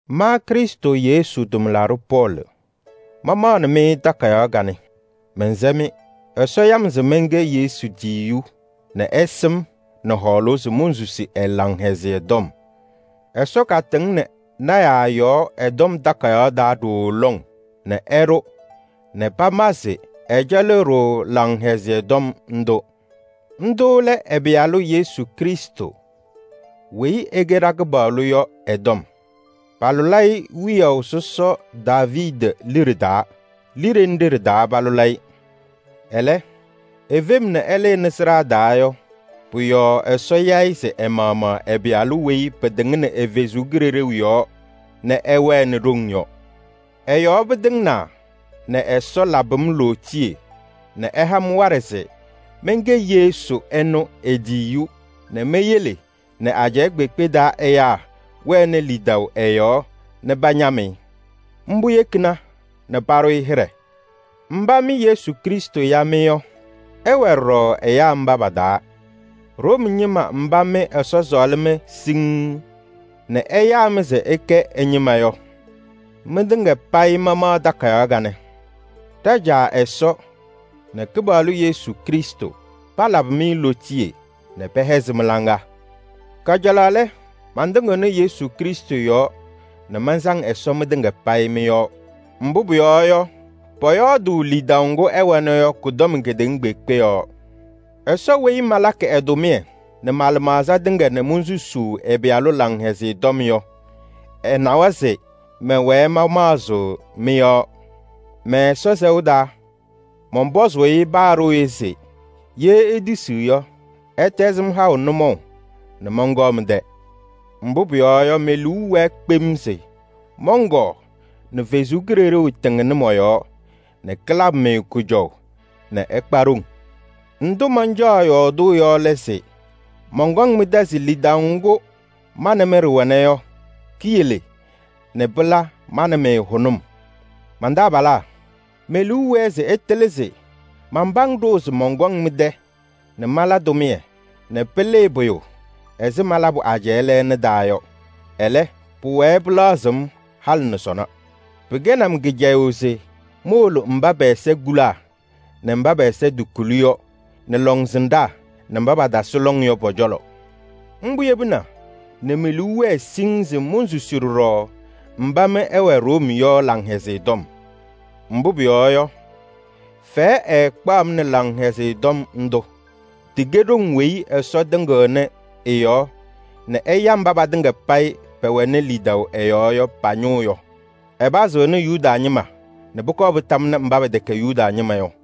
Ma Krɩstʋ Yesu tʋmlaɖʋ Pɔɔlɩ, mamaɣnɩ-mɩ takayaɣ kanɛ, mɛnsɛ-mɩ. Ɛsɔ ya-m se mɛnkɛ Yesu tiyiyu nɛ ɛsɩ-m nɛ hɔɔlʋʋ se monsusi ɛ-Laŋhɛzɩyɛ Tɔm. Ɛsɔ katɩŋnɩ lɔɔyɩsɩ tɩnaa yɔɔ ɛ-Tɔm Takayaɣ taa ɖooo lɔŋ nɛ ɛɖʋ nɛ pama se ɛcɛlɩɣ-ɖʋ Laŋhɛzɩyɛ Tɔm ndʋ. Ndʋ lɛ ɛ-Pɩyalʋ Yesu Krɩstʋ weyi ɛkɛ ɖa-Kɩpaɣlʋ yɔ ɛ-tɔm. Palʋlɩ-ɩ wiyaʋ sɔsɔ Daaviidi liɖe taa. Liɖe nɖɩ ɖɩ-taa palʋlɩ-ɩ, ɛlɛ, efem nɛ ɛlɩnɩ sɩɖaa taa yɔ, pʋ-yɔɔ Ɛsɔ ya-ɩ se ɛ-maɣmaɣ ɛ-Pɩyalʋ weyi pɩtɩŋnɩ ɛ-Kalɩzaɣ yɔɔ nɛ ɛwɛnɩ ɖoŋ yɔ. Ɛ-yɔɔ pɩtɩŋnaa nɛ Ɛsɔ labɩ-m lootiye nɛ ɛha-m waɖɛ se mɛnkɛ Yesu ɛnʋ e-tiyiyu nɛ meyele nɛ ajɛɛ kpeekpe taa ɛyaa wɛnɩ lidaʋ ɛ-yɔɔ nɛ pañam-ɩ. Mbʋ yekina nɛ paɖʋ-ɩ hɩɖɛ. Mba mɩ Yesu Krɩstʋ ya-mɩ yɔ, ɩwɛ ɖɔɖɔ ɛyaa mba pa-taa. Room ñɩma mba mɩ Ɛsɔ sɔɔlɩ-mɩ siŋŋ nɛ ɛyaa-mɩ se ɩkɛ ɛ-ñɩma yɔ, mɩtɩŋa payɩ mamaɣ takayaɣ kanɛ. Ɖa-Caa Ɛsɔ nɛ Kɩpaɣlʋ Yesu Krɩstʋ palabɩ-mɩ lootiye nɛ pɛhɛzɩ mɩ-laŋa! Kajalaɣ lɛ, mantɩŋɩɣnɩ Yesu Krɩstʋ yɔɔ nɛ mansaŋ Ɛsɔ mɩtɩŋa payɩ mɩ-yɔɔ. Mbʋ pʋyɔɔ yɔ, pɔyɔɔdʋʋ lidaʋ ŋgʋ ɩwɛnɩ pɔ-yɔɔ yɔ kʋ-tɔm kedeŋa kpeekpe. Ɛsɔ weyi malakɩ ɛ-tʋmɩyɛ nɛ ma-lɩmaɣza tɩŋa nɛ monsusuu ɛ-Pɩyalʋ Laŋhɛzɩyɛ Tɔm yɔ, ɛnawa se mɛwɛɛ mamaɣzɩɣ mɩ-yɔɔ mɛ-Ɛsɔ sɛʋ taa. Mɔnpɔzʋʋ-ɩ paa ɖooye se ye etisiɣ yɔ, ɛtɛzɩ-m haʋ nʋmɔʋ nɛ mɔnkɔɔ mɩ-tɛ. Mbʋ pʋyɔɔ yɔ, me-liu wɛɛ kpem se mɔnkɔɔ nɛ Ɛsɔ Kalɩzaɣ tɩŋnɩ mɔ-yɔɔ nɛ kalabɩ-mɩ kʋjɔʋ nɛ ɩkpa ɖoŋ. Ndʋ mancaɣ yɔɔdʋʋ yɔ lɛ se mɔnkɔŋ mɩ-tɛ se lidaʋ ŋgʋ ma nɛ mɩ ɖɩwɛna yɔ, kiyele nɛ pɩla ma nɛ mɩ hʋnʋm. Man-taabalaa! Me-liu wɛɛ se ɩtɩlɩ se manpam ɖʋʋ se mɔnkɔŋ mɩ-tɛ nɛ mala tʋmɩyɛ nɛ pɩlɩɩ pʋyʋ ɛzɩ malabʋ ajɛɛ lɛɛna taa yɔ. Ɛlɛ, pʋwɛɛ pɩlaɣzɩɣ-m halɩ nɛ sɔnɔ. Pɩkɛnɩ-m kɩcɛyʋʋ se mowolo mba pɛ-ɛza kulaa nɛ mba pɛ-ɛza tokuli yɔ, nɛ lɔŋsɩnɖaa nɛ mba patasɩ lɔŋ yɔ pɔ-cɔlɔ. Mbʋ yebina nɛ me-liu wɛɛ siŋŋ se monsusi ɖɔɖɔ mba mɩ ɩwɛ Room yɔ Laŋhɛzɩyɛ Tɔm. Mbʋ pʋyɔɔ yɔ, fɛyɛ ɛɛkpaɣ-m nɛ Laŋhɛzɩyɛ Tɔm ndʋ: tɩkɛ ɖoŋ weyi Ɛsɔ tɩŋɩɣnɩ ɛ-yɔɔ nɛ ɛya mba patɩŋa payɩ pɛwɛɣnɩ lidaʋ ɛ-yɔɔ yɔ pa-ñʋʋ yɔ. Ɛpazɩɣnɩ Yuda ñɩma nɛ pʋkɔɔ pɩtamnɩ mba pɛtɛkɛ Yuda ñɩma yɔ.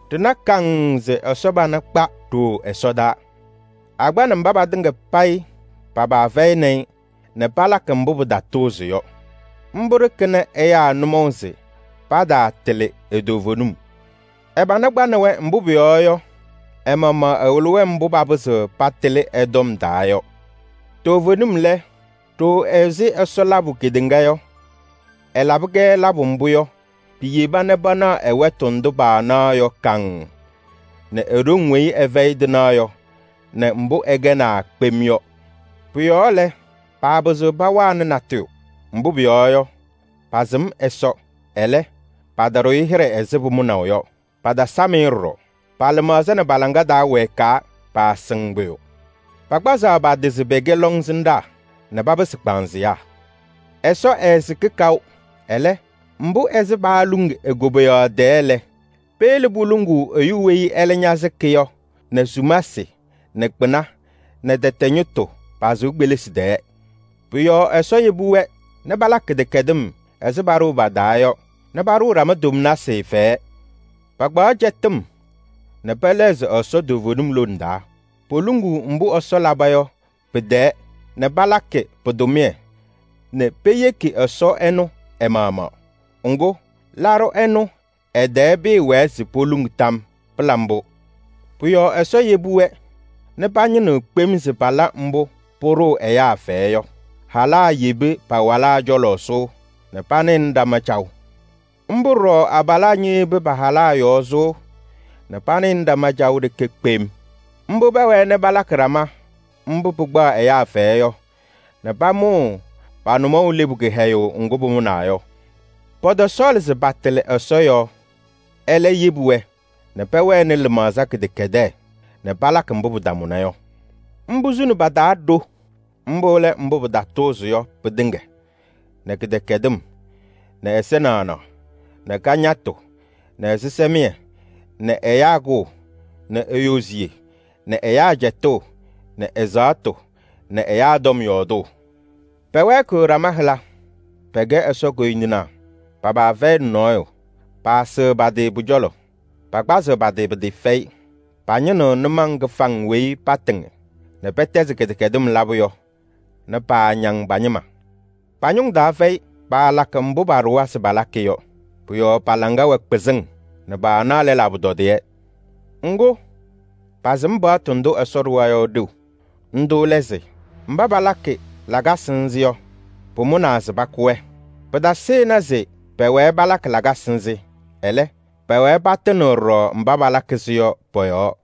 Ɖɩna kaŋŋ se Ɛsɔ pana kpa ɖooo ɛsɔdaa. Akpanɩ mba patɩŋa payɩ pa-paa fɛyɩnɩ-ɩ nɛ palakɩ mbʋ pɩtatʋʋzɩ yɔ. Mbʋ ɖɩkɩnɩ ɛyaa nʋmɔʋ se pataatɩlɩ e-toovenim. Ɛ-pana kpaɣnɩ-wɛ, mbʋ pʋyɔɔ yɔ, ɛ-maɣmaɣ ɛwɩlɩ-wɛ mbʋ papɩzɩɣ patɩlɩ ɛ-tɔm taa yɔ. Toovenim lɛ, ɖooo ɛzɩ Ɛsɔ labʋ kedeŋa yɔ, ɛlabɩ-kɛ labʋ mbʋ yɔ, piyeba nɛ panaɣ ɛ-wɛtʋ ndʋ paanaɣ yɔ kaŋŋ nɛ e-ɖoŋ weyi ɛfɛyɩ tɩnaɣ yɔ nɛ mbʋ ɛkɛnaa kpem yɔ. Pʋ-yɔɔ lɛ, paapɩzɩɣ pawanɩ natʋyʋ. Mbʋ pʋyɔɔ yɔ, pasɩm Ɛsɔ, ɛlɛ, pataɖʋ-ɩ hɩɖɛ ɛzɩ pʋmʋnaʋ yɔ, patasam-ɩ ɖɔɖɔ. Pa-lɩmaɣza wɛɛkaa nɛ pɔ-hɔ cɔɔ, paasɩŋ pʋyʋ. Pakpazaɣ pa-tɩ se pɛkɛ lɔŋsɩnɖaa nɛ papɩsɩ kpaanzɩyaa. Ɛsɔ ɛɛsɩkɩ kaʋ, ɛlɛ, ɛzɩ paaluŋ e-koboyaɣ tɛɛ lɛ, peyele poluŋuu ɛyʋ weyi ɛlɛ ñasɩkɩ yɔ nɛ sumasɩ nɛ kpɩna nɛ tɛtɛ ñɩtʋ pa-sɩʋ kpelisi tɛɛ. Pʋ-yɔɔ Ɛsɔ yebi-wɛ nɛ palakɩ kɩdɛkɛdɩm ɛzɩ paɖʋʋ pa-taa yɔ nɛ paɖʋʋ ɖama tomnasɩ fɛyɛ. Pakpaɣ cɛtɩm nɛ pɛlɛɣzɩ Ɛsɔ toovenim lone taa. Poluŋuu mbʋ Ɛsɔ laba yɔ pɩ-tɛɛ nɛ palakɩ pɩ-tʋmɩyɛ nɛ peyeki Ɛsɔ ɛnʋ ɛ-maɣmaɣ. Ŋgʋ, laɖʋ ɛnʋ ɛ-tɛɛ pɩɩwɛɛ se poluŋ tam yɔɔ. Pɩla mbʋ! Pʋ-yɔɔ Ɛsɔ yebi-wɛ nɛ pañɩnɩɣ kpem se pala mbʋ pʋɖʋʋ ɛyaa fɛyɛ yɔ: halaa yebi pa-walaa cɔlɔ sʋʋ nɛ panɩɣnɩ ɖama caɣʋ. Mbʋ ɖɔɖɔ abalaa ñeyebi pa-halaa yɔɔ sʋʋ nɛ panɩɣnɩ ɖama caʋ ɖeke kpem. Mbʋ pɛwɛɛ nɛ palakɩ ɖama mbʋ pɩkpaɣ ɛyaa fɛyɛ yɔ nɛ pamʋʋ pa-nʋmɔʋ lebu kɩhɛyʋʋ ŋgʋ pʋmʋnaa yɔ. Pɔtɔsɔɔlɩ se patɩlɩ Ɛsɔ yɔɔ, ɛlɛ yebi-wɛ nɛ pɛwɛnɩ lɩmaɣza kɩdɛkɛdɛɛ nɛ palakɩ mbʋ pɩtamʋna yɔ. Mbʋ suni pa-taa ɖo. Mbʋ lɛ: kɩtatʋʋzɩtʋ tɩŋa nɛ kɩdɛkɛdɩm nɛ ɛza naɣnaɣ nɛ kañatʋ nɛ ɛzɩsɛmɩyɛ nɛ ɛyaa kʋʋ nɛ eyoziye nɛ ajiitu nɛ ɛzaɣtʋ nɛ ɛyaa tɔm yɔɔdʋʋ. Pɛwɛɛkɩɣ ɖama hɩla. Pɛkɛ Ɛsɔ koyindinaa, pa-paa fɛyɩnɩ nɔɔyʋ, paasɩɣ pa-tɩ pʋ-cɔlɔ, pakpazɩɣ pa-tɩ pɩtɩɩfɛyɩ. Pañɩnɩɣ nʋmɔŋ kɩfaŋ weyi patɩŋ nɛ pɛtɛzɩ kɩdɛkɛdɩm labʋ yɔ nɛ paañaŋ pa-ñɩma. Pa-ñʋŋ taa fɛyɩ, paalakɩ mbʋ paɖʋwa se palakɩ yɔ. Pʋ-yɔɔ pa-laŋa wɛ kpɩzɩŋ nɛ paanaɣ lɛlaa pʋtɔdɩyɛ. Ŋgʋ, pasɩm paɣtʋ ndʋ Ɛsɔ ɖʋwa yɔ ɖeu. Ndʋ lɛ se: mba palakɩ lakasɩ nzɩ yɔ, pʋmʋnaa se pakʋ-wɛ. Pɩtasɩnɩ se pɛwɛɛ palakɩ lakasɩ nzɩ, ɛlɛ, pɛwɛɛ patɩnɩɣ ɖɔɖɔ mba palakɩ-sɩ yɔ pɔ-yɔɔ.